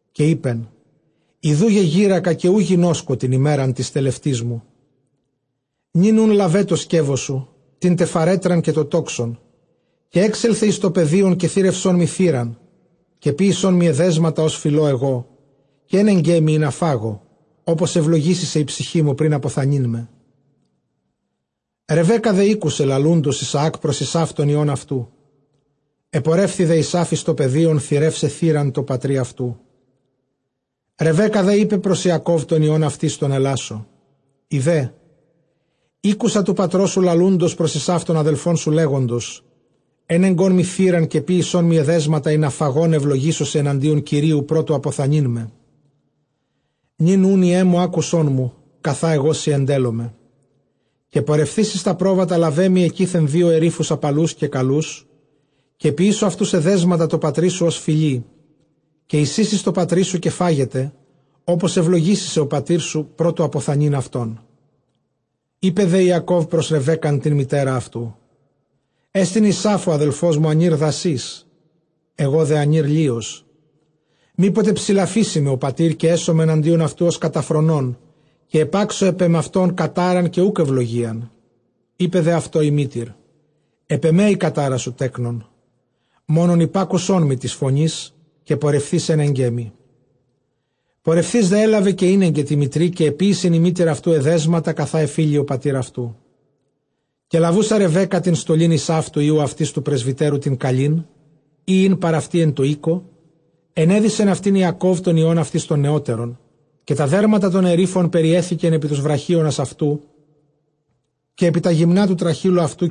Καὶ εἶπεν, ἰδοὺ γεγήρακα, καὶ οὐ γινώσκω τὴν ἡμέραν τῆς τελευτῆς μου. Νῦν οὖν λάβε τὸ σκεῦός σου, τήν τε φαρέτραν, καὶ τὸ τόξον, καὶ ἔξελθε εἰς τὸ πεδίον, καὶ θήρευσόν μοι θήραν. Καὶ ποίησόν μοι ἐδέσματα, ὡς φιλῶ ἐγὼ, καὶ ἔνεγκέ μοι, ἵνα φάγω, ὅπως εὐλογήσῃ σε ἡ ψυχή μου πρὶν ἀποθανεῖν με. Ῥεβέκκα δὲ ἤκουσε λαλοῦντος Ἰσαὰκ πρὸς Ἡσαῦ τὸν υἱὸν αὐτοῦ· ἐπορεύθη δὲ Ἡσαῦ εἰς τὸ πεδίον θηρεῦσαι θήραν τῷ πατρὶ αὐτοῦ. Ῥεβέκκα δὲ εἶπε πρὸς τὸν Ἰακὼβ τὸν υἱὸν αὐτῆς τὸν ἐλάσσω, ἴδε, ἤκουσα τοῦ πατρός σου λαλοῦντος πρὸς Ἡσαῦ τὸν ἀδελφόν σου, λέγοντος, Ἔνεγκόν μοι θήραν, καὶ ποίησόν μοι ἐδέσματα, ἵνα φαγὼν εὐλογήσω σε ἐναντίον Κυρίου πρὸ τοῦ ἀποθανεῖν με. Νῦν οὖν, υἱέ μου, ἄκουσόν μου, καθὰ ἐγώ σοι ἐντέλλομαι. Καὶ πορευθεὶς εἰς τὰ πρόβατα, λάβε μοι ἐκεῖθεν δύο ἐρίφους ἁπαλοὺς καὶ καλοὺς, καὶ ποιήσω αὐτοὺς ἐδέσματα τῷ πατρί σου, ὡς φιλεῖ. Καὶ εἰσοίσεις τῷ πατρί σου, καὶ φάγεται, ὅπως εὐλογήσῃ σε ὁ πατήρ σου πρὸ τοῦ ἀποθανεῖν αὐτόν. Εἶπε δὲ Ἰακὼβ πρὸς Ῥεβέκκαν τὴν μητέρα αὐτοῦ, ἔστιν Ἡσαῦ ὁ ἀδελφός μου ἀνὴρ δασὺς, ἐγὼ δὲ ἀνὴρ λεῖος. Μή ποτε ψηλαφήσῃ με ὁ πατὴρ, καὶ ἔσομαι ἐναντίον αὐτοῦ ὡς καταφρονῶν, καὶ ἐπάξω ἐπʼ ἐμαυτὸν κατάραν, καὶ οὐκ εὐλογίαν. Εἶπε δὲ αὐτῷ ἡ μήτηρ, ἐπʼ ἐμὲ ἡ κατάρα σου, τέκνον· μόνον ἐπάκουσόν μου τῆς φωνῆς, καὶ πορευθεὶς ἔνεγκέ μοι. Πορευθεὶς δὲ ἔλαβε, καὶ ἤνεγκε τῇ μητρί· καὶ ἐποίησεν ἡ μήτηρ αὐτοῦ ἐδέσματα, καθὰ ἐφίλει ὁ πατὴρ αὐτοῦ. Καὶ λαβοῦσα Ῥεβέκκα τὴν στολὴν Ἡσαῦ τοῦ υἱοῦ αὐτῆς τοῦ πρεσβυτέρου τὴν καλὴν, ἣ ἦν παρʼ αὐτῇ ἐν τῷ οἴκῳ, ἐνέδυσεν αὐτὴν Ἰακὼβ τὸν υἱὸν αὐτῆς τὸν νεώτερον. Καὶ τὰ δέρματα τῶν ἐρίφων περιέθηκεν ἐπὶ τοὺς βραχίονας αὐτοῦ, καὶ ἐπὶ τὰ γυμνὰ τοῦ τραχήλου αὐτοῦ.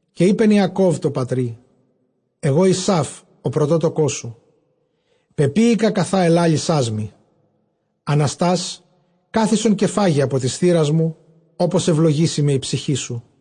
Καὶ εἶπεν Ἰακὼβ τῷ πατρὶ, ἐγὼ Ἡσαῦ ὁ πρωτότοκός σου πεποίηκα καθὰ ἐλάλησάς μοι· ἀναστὰς κάθισον, καὶ φάγε ἀπὸ τῆς θήρας μου, ὅπως εὐλογήσῃ με ἡ ψυχή σου.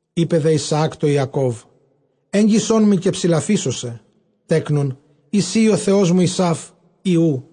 Εἶπε δὲ Ἰσαὰκ τῷ Ἰακὼβ, ἔγγισόν μοι, καὶ ψηλαφήσω σε, τέκνον, εἰ σὺ εἶ ὁ υἱός μου Ἡσαῦ, ἢ οὔ.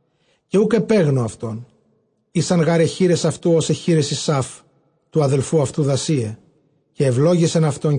Καὶ οὐκ ἐπέγνω αὐτὸν, ἦσαν γὰρ αἱ χεῖρες αὐτοῦ, ὡς αἱ χεῖρες Ἡσαῦ τοῦ ἀδελφοῦ αὐτοῦ, δασεῖαι· καὶ εὐλόγησεν αὐτὸν,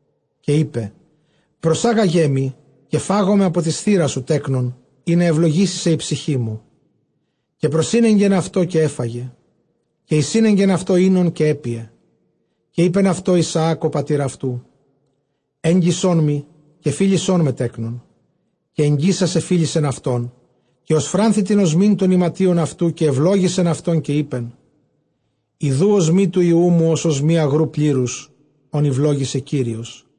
Καὶ εἶπε, προσάγαγέ μοι, καὶ φάγομαι ἀπὸ τῆς θήρας σου, τέκνον, ἵνα εὐλογήσῃ σε ἡ ψυχή μου· καὶ προσήνεγκεν αὐτῷ, καὶ ἔφαγε· καὶ εἰσήνεγκεν αὐτῷ οἶνον, καὶ ἔπιε. Καὶ εἴπεν αὐτῷ Ἰσαὰκ ὁ πατὴρ αὐτοῦ, ἔγγισόν μοι, καὶ φίλησόν με, τέκνον. Καὶ ἐγγίσας ἐφίλησεν αὐτόν· καὶ ὠσφράνθη τὴν ὀσμὴν τῶν ἱματίων αὐτοῦ, καὶ εὐλόγησεν αὐτὸν, καὶ εἶπεν, ἰδοὺ ὀσμὴ τοῦ υἱοῦ μου, ὡς ὀσμὴ ἀγροῦ πλήρους, ὃν εὐλόγησε Κύριος.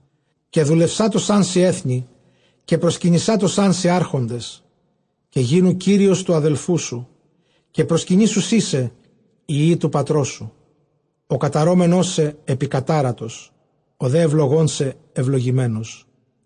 Καὶ δουλευσάτωσάν σοι ἔθνη, καὶ προσκυνησάτωσάν σοι ἄρχοντες· καὶ γίνου κύριος τοῦ ἀδελφοῦ σου, καὶ προσκυνήσουσί σοι οἱ υἱοὶ τοῦ πατρός σου· ὁ καταρώμενός σε, ἐπικατάρατος· ὁ δὲ εὐλογῶν σε, εὐλογημένος.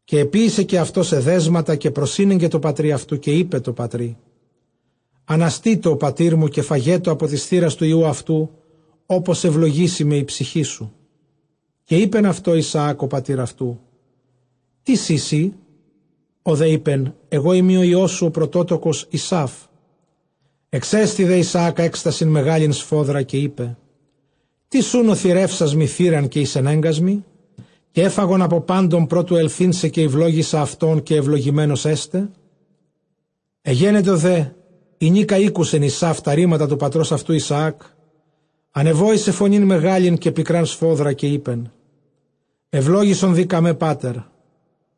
Καὶ ἐποίησε καὶ αὐτὸς ἐδέσματα, καὶ προσήνεγκε τῷ πατρὶ αὐτοῦ· καὶ εἶπε τῷ πατρὶ, ἀναστήτω ὁ πατήρ μου, καὶ φαγέτω ἀπὸ τῆς θήρας τοῦ υἱοῦ αὐτοῦ, ὅπως εὐλογήσῃ με ἡ ψυχή σου. Καὶ εἶπεν αὐτῷ Ἰσαὰκ ὁ πατὴρ αὐτοῦ, τίς εἶ σύ; ὁ δὲ εἶπεν, ἐγώ εἰμι ὁ υἱός σου ὁ πρωτότοκος Ἡσαῦ. Ἐξέστη δὲ Ἰσαὰκ ἔκστασιν μεγάλην σφόδρα, καὶ εἶπε, τίς οὖν ὁ θηρεύσας μοι θήραν καὶ εἰσενέγκας μοι, καὶ ἔφαγον ἀπὸ πάντων πρὸ τοῦ ἐλθεῖν σε; καὶ εὐλόγησα αὐτὸν, καὶ εὐλογημένος ἔσται. Ἐγένετο δὲ ἡνίκα ἤκουσεν Ἡσαῦ τὰ ῥήματα τοῦ πατρὸς αὐτοῦ Ἰσαὰκ, ἀνεβόησε φωνὴν μεγάλην καὶ πικρὰν σφόδρα· καὶ εἶπεν, εὐλόγησον δὴ κᾀμὲ, πάτερ.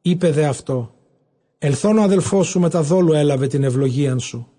Εἶπε δὲ αὐτῷ, ἐλθὼν ὁ ἀδελφός σου μετὰ δόλου ἔλαβε τὴν εὐλογίαν σου.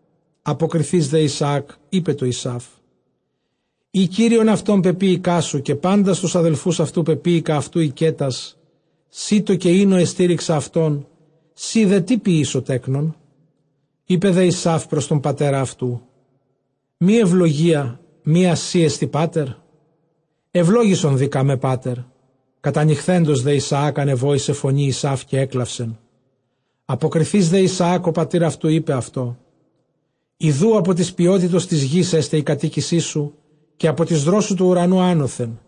Ἀποκριθεὶς δὲ Ἰσαὰκ εἶπε τῷ Ἡσαῦ, εἰ κύριον αὐτὸν πεποίηκά σου, καὶ πάντας τοὺς ἀδελφοὺς αὐτοῦ πεποίηκα αὐτοῦ οἰκέτας· σίτῳ καὶ οἴνῳ ἐστήριξα αὐτόν· σοὶ δὲ τί ποιήσω, τέκνον; Εἶπε δὲ Ἡσαῦ πρὸς τὸν πατέρα αὐτοῦ, μὴ εὐλογία μία σοι ἔστι, πάτερ; εὐλόγησον δὴ κᾀμὲ, πάτερ· κατανυχθέντος δὲ Ἰσαὰκ, ἀνεβόησε φωνῇ Ἡσαῦ, καὶ ἔκλαυσεν. Ἀποκοιθεὶς δὲ Ἰσαὰκ ὁ πατὴρ αὐτοῦ εἶπεν αὐτῷ, ἰδοὺ ἀπὸ τῆς πιότητος τῆς γῆς ἔσται ἡ κατοίκησίς σου, καὶ ἀπὸ τῆς δρόσου τοῦ οὐρανοῦ ἄνωθεν.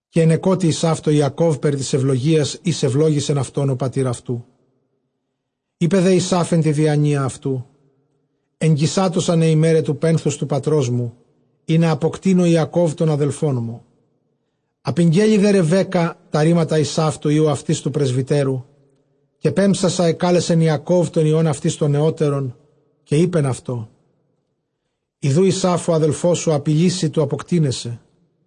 Καὶ ἐνεκότει Ἡσαῦ τῷ Ἰακὼβ περὶ τῆς εὐλογίας, ἧς εὐλόγησεν αὐτὸν ὁ πατὴρ αὐτοῦ· εἶπε δὲ Ἡσαῦ ἐν τῇ διανοίᾳ αὐτοῦ, ἐγγισάτωσαν αἱ ἡμέραι τοῦ πένθους τοῦ πατρός μου, ἵνα ἀποκτείνω Ἰακὼβ τὸν ἀδελφόν μου. Ἀπηγγέλη δὲ Ῥεβέκκᾳ τὰ ῥήματα Ἡσαῦ τοῦ υἱοῦ αὐτῆς τοῦ πρεσβυτέρου· καὶ πέμψασα ἐκάλεσεν Ἰακὼβ τὸν υἱὸν αὐτῆς τὸν νεώτερον, καὶ εἶπεν αὐτῷ, ἰδοὺ Ἡσαῦ ὁ ἀδελφός σου ἀπειλεῖ σοι τοῦ ἀποκτεῖναί σε.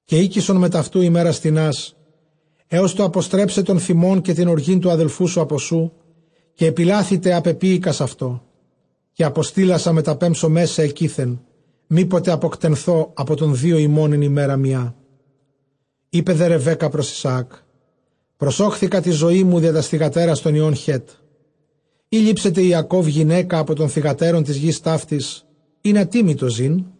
Καὶ οἴκησον μετʼ αὐτοῦ ἡμέρας τινὰς, ἕως τοῦ ἀποστρέψαι τὸν θυμὸν, καὶ τὴν ὀργὴν τοῦ ἀδελφοῦ σου ἀπὸ σοῦ, καὶ ἐπιλάθηται ἃ πεποίηκας αὐτῷ· καὶ ἀποστείλασα μεταπέμψομαί σε ἐκεῖθεν, μή ποτε ἀποτεκνωθῶ ἀπὸ τῶν δύο ὑμῶν ἐν ἡμέρᾳ μιᾷ. Εἶπε δὲ Ῥεβέκκα πρὸς Ἰσαὰκ, προσώχθικα τῇ ζωῇ μου διὰ τὰς θυγατέρας τῶν υἱῶν Χέτ· εἰ λήψεται Ἰακὼβ γυναῖκα ἀπὸ τῶν θυγατέρων τῆς γῆς ταύτης, ἵνα τί μοι τὸ ζῇν;